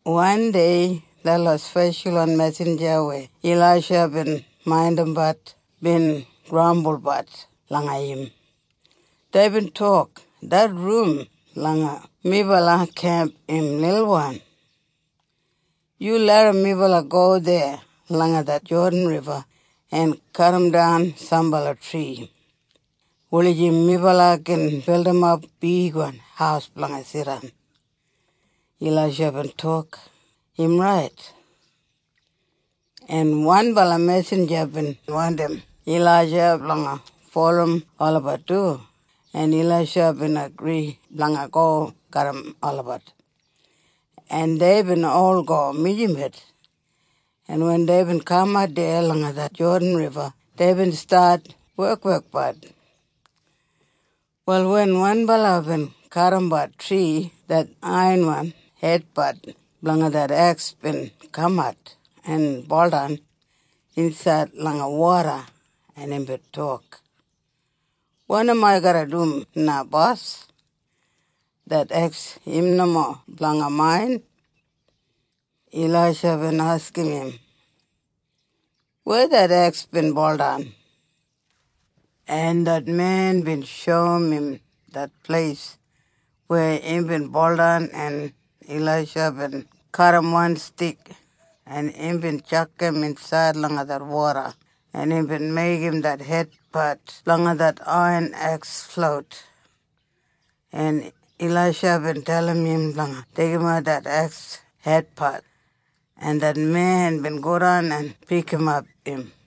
Wandei detlot speshalwan mesinja weya Ilaisha bin maindimbat bin grambulbat langa im. Deibin tok, “Det rum langa melabat kemp im lilwan! Yu larram melabat go deya langa det Jodan Riba en kadimdan sambala tri, wulijim melabat gin bildimap bigwan haus blanga jidan.” Ilaisha bin tok, “Im rait.” En wanbala mesinja bin wandim Ilaisha blanga bulurrum olabat du en Ilaisha bin agri blanga go garram olabat. En deibin ol go mijamet en wen deibin kamat deya langa det Jodan Riba deibin stat wekwekbat. Wal wen wanbala bin kadimbat tri det aiyan hedpat blanga det eks bin kamat en buldan insaid langa woda en imbin tok, “Wanim ai garra dum na bos? Det eks im nomo blanga main!” Ilaisha bin askim im, “Weya det eks bin buldan?” En det men bin shoum im det pleis weya imbin buldan en Ilaisha bin kadim wan stik en imbin tjakam insaid langa det woda en imbin meigim det hedpat blanga det aiyan eks flout. En Ilaisha bin dalim im blanga deigimat det eks hedpat, en det men bin godan en pikimap im.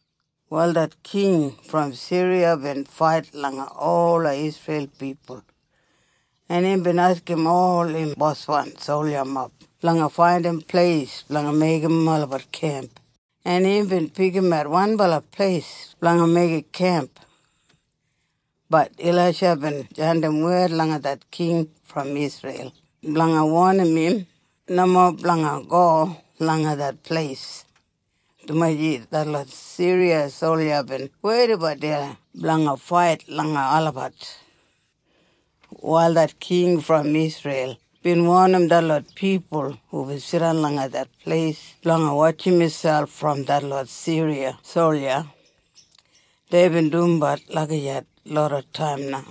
Wal det king brom Siriya bin fait langa ola Isreil pipul, en imbin askim ol im boswan soljamob blanga faindim pleis blanga meigim olabat kemp en imbin pikimat wanbala pleis blanga meigim kemp. Bat Ilaisha bin jandim wed langa det king brom Isreil blanga wonim im nomo blanga go langa det pleis, dumaji detlot Siriya solja bin weidabat deya blanga fait langa olabat. Wal det king brom Isreil bin wonim detlot pipul hubin jidan langa det pleis blanga wotjim miselp brom detlot Siriya solja. Deibin dumbat lagijat loda taim na.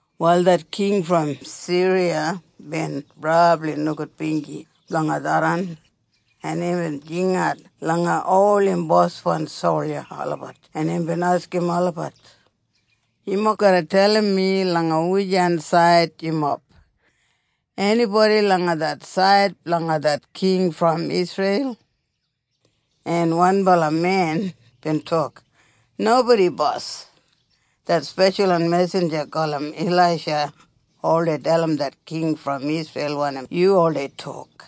Wal det king brom Siriya bin brabli nogudbinji blanga tharran, en imbin jingat langa ol im boswan solja olabat en imbin askim olabat, “Yumob garra dalim mi langa wujan said yumob! Enibodi langa det said blanga det king brom Isreil?” En wanbala men bin tok, “Nobodi bos. Det speshalwan mesinja gulum Ilaisha oldei dalim det king brom Isreil wanim yu oldei tok,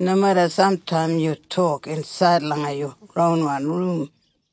nomeda samtaim yu tok insaid langa yu ronwan rum.”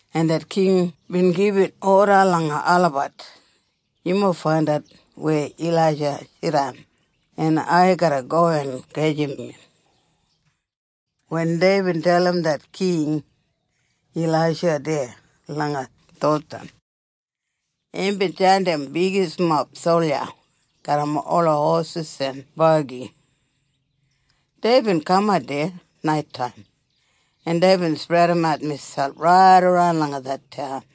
En det king bin gibit oda langa olabat, “Yumob faindat weya Ilaisha jidan, en ai garra go en gajim im.” Wen deibin dalim det king, “Ilaisha deya langa Dothan.” Imbin jandim bigismob solja garram ola hosis en bagi. Deibin kamat deya naitaim en deibin spredimat miselp raidaran langa det taun.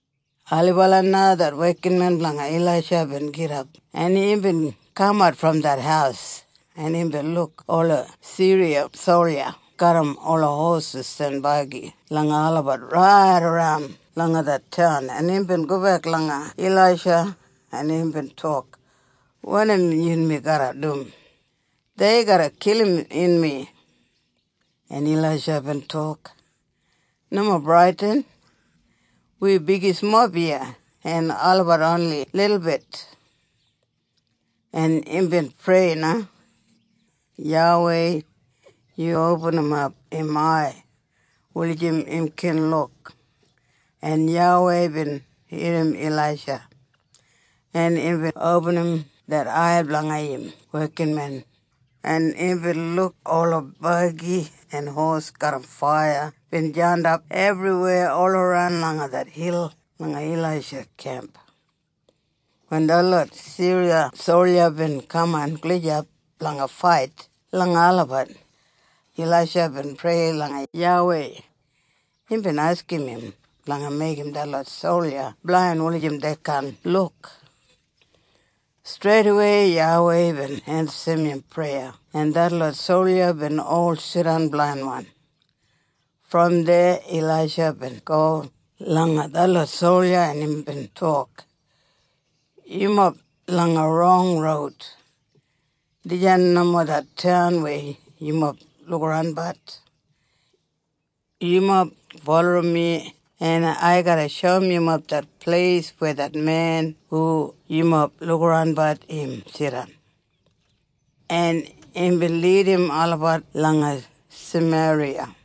Ailibala na det wekinmen blanga Ilaisha bin gidap en imbin kamat brom det haus en imbin luk ola Siriya solja garram ola hosis en bagi blanga olabat raidaran langa det taun en imbin gobek langa Ilaisha en imbin tok, “Wanim yunmi garra dum? Dei garra kilim yunmi.” En Ilaisha bin tok, “Nomo bradin! Wi bigismob iya en olabat oni lilbit.” En imbin prei na, “YAWEI, yu opinimap im ai wulijim im gin luk.” En YAWEI bin irrim Ilaisha, en imbin opinim det ai blanga im wekinmen, en imbin luk ola bagi en hosis garram faiya bin jandap ebriweya olaran langa det hil langa Ilaisha kemp. Wen detlot Siriya solja bin kaman gulijap blanga fait langa olabat. Ilaisha bin prei langa YAWEI, imbin askim im blanga meigim detlot solja blain wulijim dei kaan luk. Streidawei YAWEI bin ensim im preya en detlot solja bin ol jidan blainwan. Brom deya Ilaisha bin go langa detlot solja en imbin tok, “Yumob langa rong roud. Dijan nomo det taun weya yumob lukabat. Yumob bulurrum mi en ai garra shoum yumob det pleis weya det men hu yumob lukabat im jidan.” En imbin lidim olabat langa Sameriya.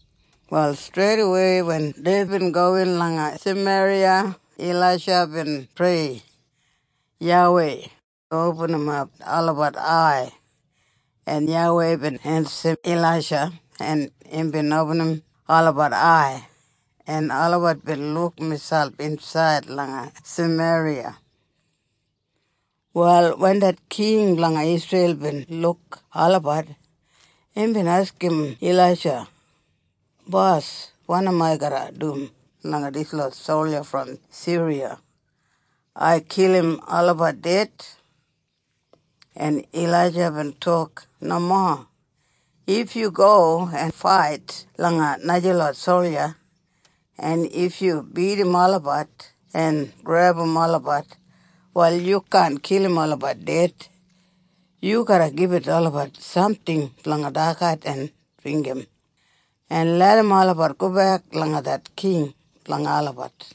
Wal streidawei wen deibin gowin langa Sameriya, Ilaisha bin prei, “YAWEI, opinimap olabat ai.” En YAWEI bin ensim Ilaisha en imbin opinim olabat ai, en olabat bin luk miselp insaid langa Sameriya. Wal wen det king blanga Isreil bin luk olabat, imbin askim Ilaisha, “Bos, wanim ai garra dum langa dislot solja brom Siriya? Ai kilim olabat ded?” En Ilaisha bin tok, “Nomo! If yu go en fait langa najalot solja en if yu bidim olabat en grebum olabat, wal yu kaan kilim olabat ded. Yu garra gibit olabat samting blanga dagat en dringgim, en larram olabat gobek langa det king blanga olabat.”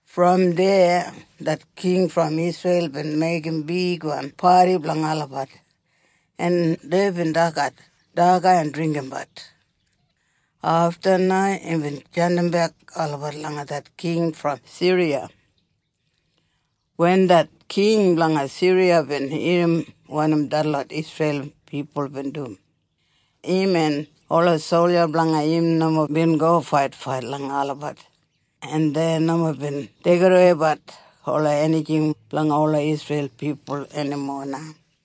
Brom deya det king brom Isreil bin meigim bigwan padi blanga olabat en deibin dagat daga en dringgimbat. Afta na imbin jandimbek olabat langa det king brom Siriya. Wen det king blanga Siriya bin irrim wanim detlot Isreil pipul bin dum, im en ola solja blanga im nomo bin go faitfait langa olabat, en dei nomo bin deigidaweibat ola enijing blanga ola Isreil pipul enimo na.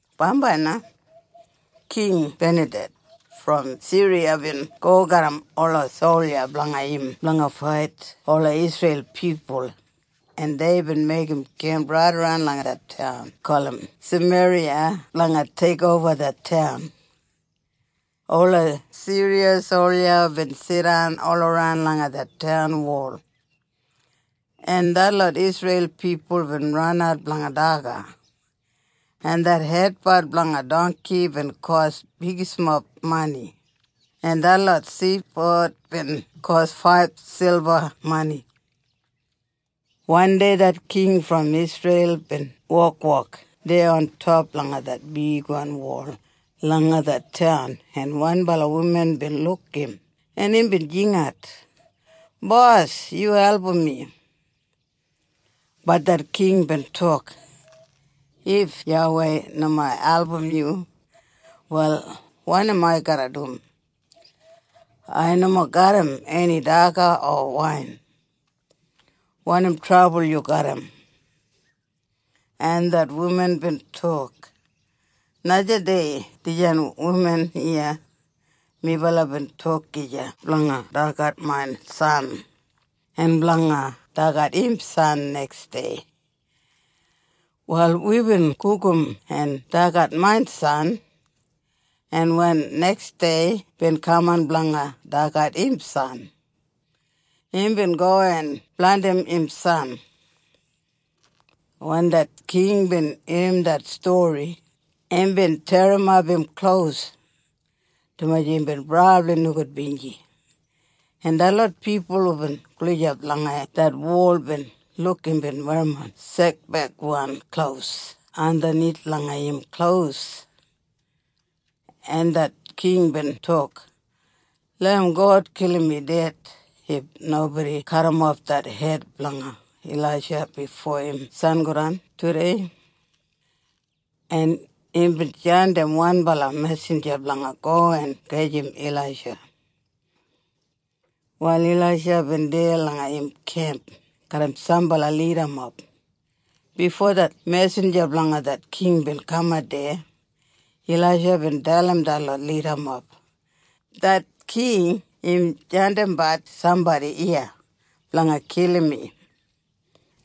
Bambai na, King Benaded brom Siriya bin go garram ola solja blanga im blanga fait ola Isreil pipul en deibin meigim kemp raidaran langa det taun gulum Sameriya blanga teikoba det taun. Ola Siriya solja bin jidan olaran langa det taun wol, en detlot Isreil pipul bin ranat blanga daga, en det hedpat blanga dongki bin kos bigismob mani, en detlot sidpod bin kos faib silba mani. Wandei det king brom Isreil bin wokwok deya ontop langa det bigwan wol langa det taun en wanbala wuman bin luk im en imbin jingat, “Bos, yu album mi.” Bat det king bin tok, “If YAWEI nomo album yu, wal wanim ai garra dum? Ai nomo garram eni daga o wain! Wanim trabul yu garram?” En det wuman bin tok, “Najadei dijan wuman iya, minbala bin tok gija blanga dagat main san, en blanga dagat im san neksdei. Wal wibin gugum en dagat main san, en wen neksdei bin kaman blanga dagat im san, imbin go en blandim im san.” Wen det king bin irrim det stori imbin terrimap im klos, dumaji imbin brabli nogudbinji. En detlot pipul hubin gulijap langa det wol bin luk imbin werrimon sekbeigwan klos andanith langa im klos. En det king bin tok, “Larram God kilim mi ded if nobodi kadimof det hed blanga Ilaisha bifo im sangodan tudei.” En imbin jandim wanbala mesinja blanga go en gajim Ilaisha. Wal Ilaisha bin deya langa im kemp garram sambala lidamob. Bifo det mesinja blanga det king bin kamat deya, Ilaisha bin dalim detlot lidamob, “Det king im jandimbat sambodi iya blanga kilim mi,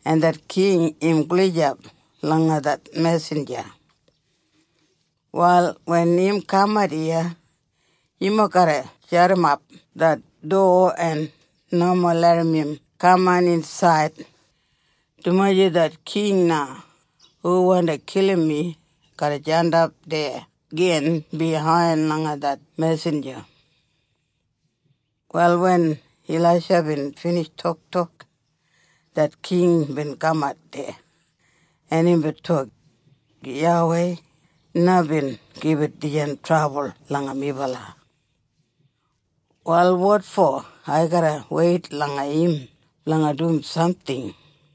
en det king im gulijap langa det mesinja. Wal wen im kamat iya yumob garra jadimap det dowa en nomo larram im kamin insaid, dumaji det king na hu wandi kilim mi garra jandap deya gin biyain langa det mesinja.” Wal wen Ilaisha bin binij toktok, det king bin kamat deya, en imbin tok, “YAWEI na bin gibit dijan trabul langa melabat. Wal wotfo ai garra weit langa im blanga dum samting?”